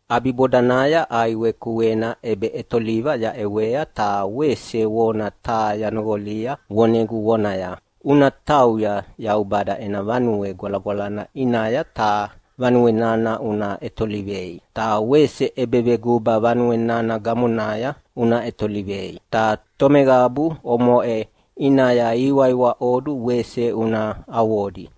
ʼAbibodanaya ʼaiwe kuena ʼebeʼetoliva yaʼewea ta wese vona taha yanoqolia vonegu vonaya, “Una tauya Yaubada ena Vanue Gwalagwalana ʼinaya ta vanue nana una ʼetolivei, ta wese ʼebeveguba vanue nana gamonaya una ʼetolivei. Ta tomeqabu omoʼe ʼinaya ihiwaiwaʼodu wese una avodi.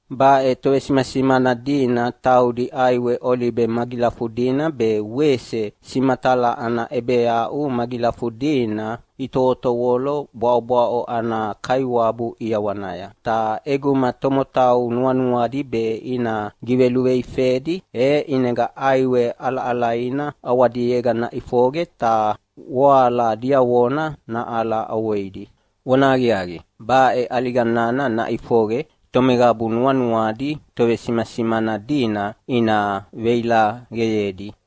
Baʼe tovesimasimana dina taudi ʼaiwe olibe magilafudina be wese simatala ana ʼebeaʼu magilafudina itovotovolo bwaʼobwaʼo ana Kaiwabu ʼiawanaya. Ta ʼeguma tomotau nuanuadi be ina giveluveifedi, e ʼinega ʼaiwe ʼalaʼalaina ʼawadiega naʼifoqe ta voala diavona naʼala ʼovoidi. Vonahaqiaqi, baʼe ʼaliga nana naʼifoqe tomeqabu nuanuadi tovesimasimana dina ina veilaqeyedi.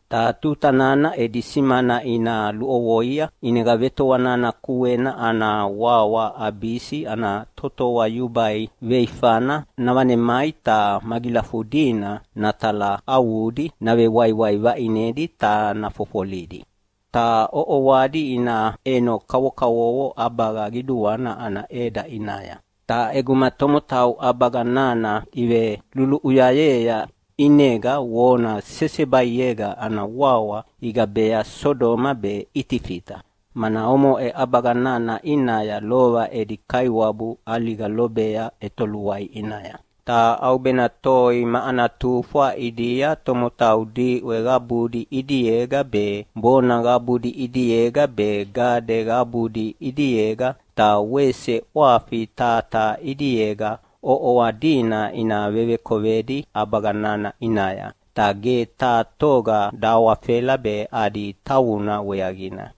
Ta tuta nana edi simana ina luʼovoia, ʼinega vetoa nana kuena ana wawa Abisi ana totoa yubai veifana navanemai ta magilafudina natalaʼavudi navewaiwai vaʼinedi ta nafofolidi. Ta ʼoʼoadi ina ʼeno kavokavovo ʼabaga qiduana ana ʼeda ʼinaya. Ta ʼeguma tomotau ʼabaga nana iveluluʼuyayea ʼinega vona sesebaiega ana wawa igabea Sodoma be Itifita, mana omoʼe ʼabaga nana ʼinaya lova edi Kaiwabu ʼaliga lobea ʼetoluai ʼinaya. Ta ʼaubena toi ma ana tufwa ʼidia tomotau diʼwe qabudi ʼidiega be, bona qabudi ʼidiega be, gade qabudi ʼidiega ta wese ʼwafi taha taha ʼidiega ʼoʼoa dina ina vevekovedi ʼabaga nana ʼinaya, ta ge taha toga dahawafela adi tavuna weaqina.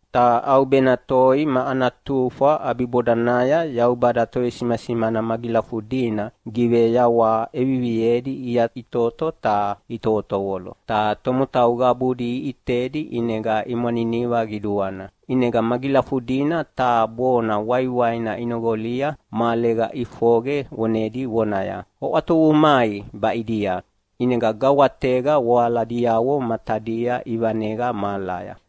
Ta ʼaubena toi ma ana tufwa ʼabibodanaya Yaubada tovesimasimana magilafudina giveyawaha ʼeviviedi iyaʼitoto ta itovolo. Ta tomotau qabudi iʼitedi ʼinega imwaniniva qiduana. ʼInega magilafudina taha bona waiwaina inoqolia mahalega ʼifoqe vonedi vonaya, “Oʼwatovu mai baʼidia!” ʼInega gawatega voaladiavo matadia ivaneqa mahalaya.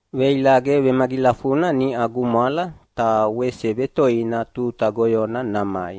Veilaqe vemagilafuna niʼa gumwala, ta wese vetoina tuta goyona namai.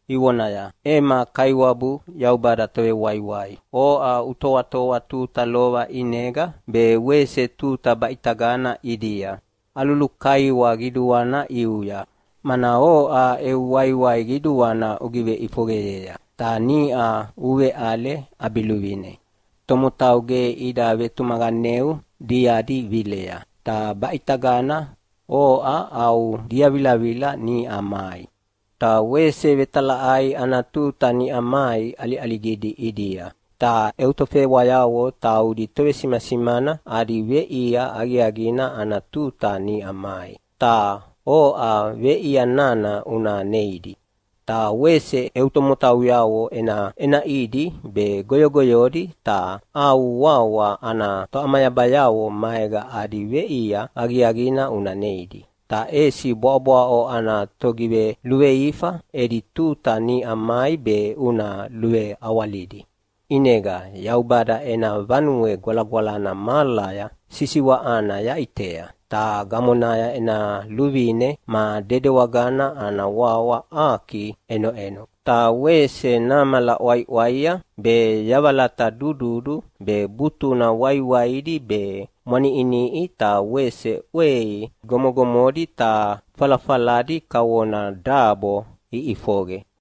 ivonaya, “Ema Kaiwabu Yaubada Tovewaiwai, oʼa utoatoa tuta lova ʼinega be wese tuta baʼitagana ʼidia. Alulukaiwa qiduana ʼiuya, mana oʼa eu waiwai qiduana ugiveʼifoqeyea ta niʼa uveʼale ʼabiluvine. Tomotau ge ida vetumaqaneu diadi vilea, ta baʼitagana oʼa au diavilavila niʼa mai. Ta wese vetalaʼai ana tuta niʼa mai ʼaliʼaligidi ʼidia. Ta eu tofewayavo taudi tovesimasimana adi veʼia aqiaqina ana tuta niʼa mai, ta oʼa veʼia nana una neidi. Ta wese eu tomotauyavo ʼenaʼenaʼidi be goyogoyodi ta au wawa ana toʼamayabayavo maega adi veʼia aqiaqina una neidi. Ta ʼesi bwaʼobwaʼo ana togiveluveifa edi tuta niʼa mai be una luveawalidi.” ʼInega Yaubada ena Vanue Gwalagwalana mahalaya sisiwaʼana yaʼitea, ta gamonaya ena luvine ma dedewagana ana wawa Aki ʼenoʼeno. Ta wese namala ʼwaiʼwaia be, yavalata dududu be, butuna waiwaidi be, mwaniʼiniʼi ta wese ʼwei gomogomodi ta falafaladi kavona dabo iʼifoqe.